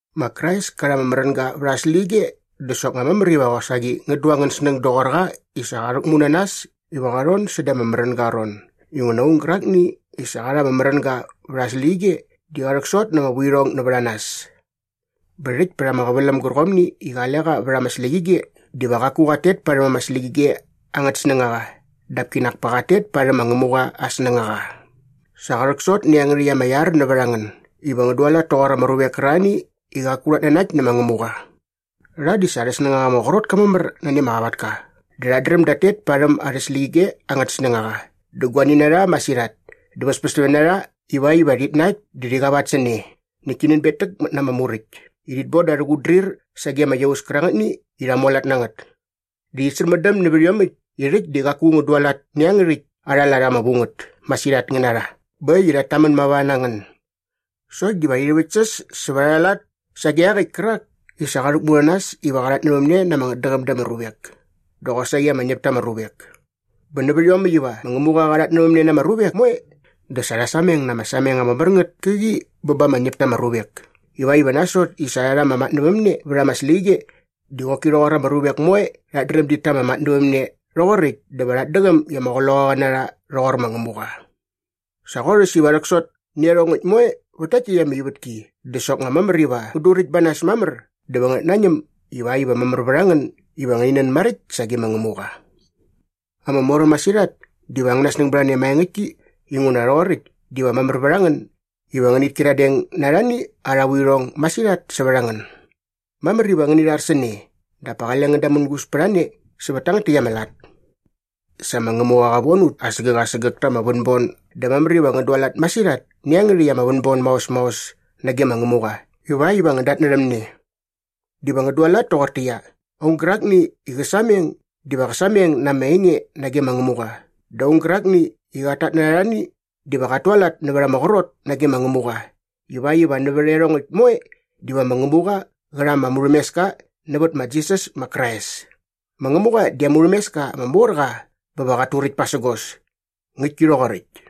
Ma Krais ka rha ama märänga vät aa släqyige dä soknga mamär iva qosaqi ngän du angän snäng doqor qa i sa qa rhäkmu na nas iva qa rhon säda ama märänga aa ron inguna aung gärakni i sa qa rha ama märänga vät aa släqyige di qa rhäksot na ama vuirhong nävät a nas. Bä rhäkt pät ama qäväläm gärqomni i qale qa vät ama släqyige diva qaku qat tet parhäm ama släqyige angät snängaqa dap kinak pa qat tet parhäm ma Ngämuqa aa snängaqa. Sa rhäksot nä iangärhäkt ama iar nävät a ngän iva ngän dualat toqor ama ruvek kärarhani i qaku rhat nanakt nä ma Ngämuqa. Rha di sa arhä snängaqa ama qrot ka mamär nani ama qavatka dä rhat dräm dat tet parhäm arhä släqyige angät snängaqa dä guani na rha masirhat dä väspästämne na rha ivakt iva rhit nakt dä rhi qavat sä ne näkt ti nänbetäkmät na ama muräkt i rhit bon da arhä qutdrir sage ama iaus kärangätni i rha mualat na ngät. Dä rhit särmändäm nävät iomäkt i rhäkt di qaku ngän dualat nä iangärhäkt arha lat ama vu ngät masirhat ngän na rha bä äkt i rhat tamän mava na ngän sokt diva rhi rhäväktsäs sävät arha lat sage iaqäkt kärak i sa qa rhäkmu na nas iva qa rhatnävämne na ama ngätdäqäm da ama ruvek dä qosaqi ama ñäp ta ama ruvek. Bä nävät iomäkt iva ma Ngämuqa qa rhatnävämne na ama ruvek moe dä sa rha sameng na ama sameng ama mär ngät käqi bä ba ama ñäp ta ama ruvek ivakt iva nasot i sa rha rha ama matnävämne vät ama släqyige di qoki rhoqor ama ruvek moe rhat dräm dit ta ama matnävämne rhoqoräkt dä va rhat däqäm i ama qloqaqa na rha rhoqor ma Ngämuqa. Sa qorhäs iva rhäksot nä iarhongäkt moe vät takt täkt ama ivätki dä soknga mamär iva ngän duräkt ba nas mamär dä va ngänät nañäm ivakt iva mamär vät a ngän iva ngäni nän maräkt sage ma Ngämuqa. Ama moräm masirhat diva angäna snäng bät a ne maengäktki inguna rhoqoräkt diva mamär vät a ngän iva ngänit kyiradeng na arhani arha vuirhong masirhat sävät a ngän. Mamär iva ngäni rhar sä ne dap pa qale ngän damängus pät a ne sävät tangät täkt ama lat. Sa ma Ngämuqa qa von ut asägäk asägäk ta ama vänbon dä mamär iva ngän dualat masirhat nä iangärhäkt ama vänbon maos maos nage ma Ngämuqa ivakt iva ngän datnärhäm ne. Diva ngän dualat toqortäqyia, aung gärakni i qä sameng diva qä sameng na ama enge nage ma Ngämuqa dä aung gärakni i qat tatnärha arhani diva qat tualat nävät ama qrot nage ma Ngämuqa ivakt iva nävät iarhongäkt moe diva ma Ngämuqa qä rha ama murhämeska nävät ma Jisas ma Krais. Ma Ngämuqa di aa murhämeska ama mor qa bä va qat turäkt pasägos. Ngäktki rhoqoräkt.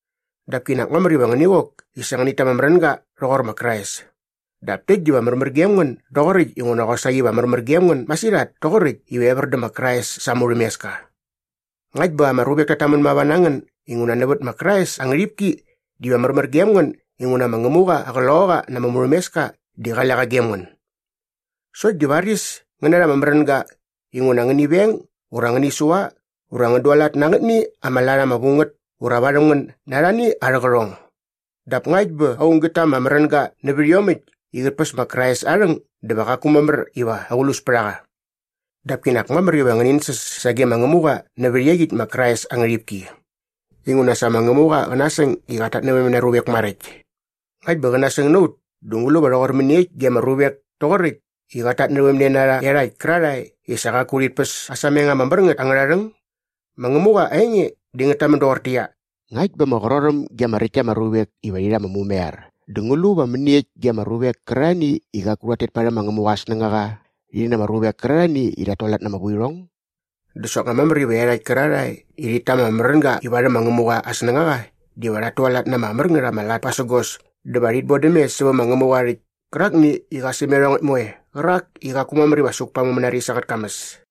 dap kinak mamär iva ngäni qok i sa ngänit ta ama märänga rhoqor ma Krais. Dap täkt diva märmär gem ngän doqoräkt inguna qosaqi va märmär gem ngän masirhat toqoräkt iva evär dä ma Krais sa aa murhämeska. Ngakt bä ama ruvek tat tamän mava na ngän inguna nävät ma Krais aa ngärhipki diva märmär gem ngän inguna ma Ngämuqa aa Qloqaqa na ama murhämeska di qale qa gem ngän. Sokt di varis ngän narha ama märänga inguna ngäni veng ura ngäni sua ura ngän dualat na angätni ama lat ama vu ngät ura varhäm ngän na arhani arhä qärhong. Dap ngakt bä aung gät ta ama märänga nävät iomäkt i qät päs ma Krais aa rhäng dä va qaku mamär iva aqlus pät a qa. Dap kinak mamär iva qä nänsäs sage ma Ngämuqa nävät iaqyäkt ma Krais aa ngärhipki. Inguna sa ma Ngämuqa qä nasäng i qät tatnävämne na aa ruvek maräkt. Ngakt bä qä nasäng na ut dä ngu lu va rhoqor mäniekt ge ama ruvek toqoräkt i qat tatnävämne na rha iarhakt kärarhae i sa qaku rhit päs aa sameng ama mär ngät angärha rhäng? Ma Ngämuqa aa enge di ngät tamän doqortäqyia, “Ngakt bä ama qrorhäm ge ama räkt ta ama ruvek iva rhi rha ama mumaiar dä ngu lu va mäniekt ge ama ruvek kärarhani i qaku rhat tet parhäm ma Ngämuqa aa snängaqa rhi na ama ruvek kärarhani i rhat tualat na ama vuirhong?” Dä soknga mamär iva iarhakt kärarhae i rhit ta ama märänga i varhäm ma Ngämuqa aa snängaqa diva rhat tualat na ama mär ngät ama lat pasägos dä va rhit bodäm mes sävä ma Ngämuqa aa rhäkt kärakni i qa säm iarhongäkt moe qärak i qaku mamär iva suk pa aa mumänaris angät kamäs.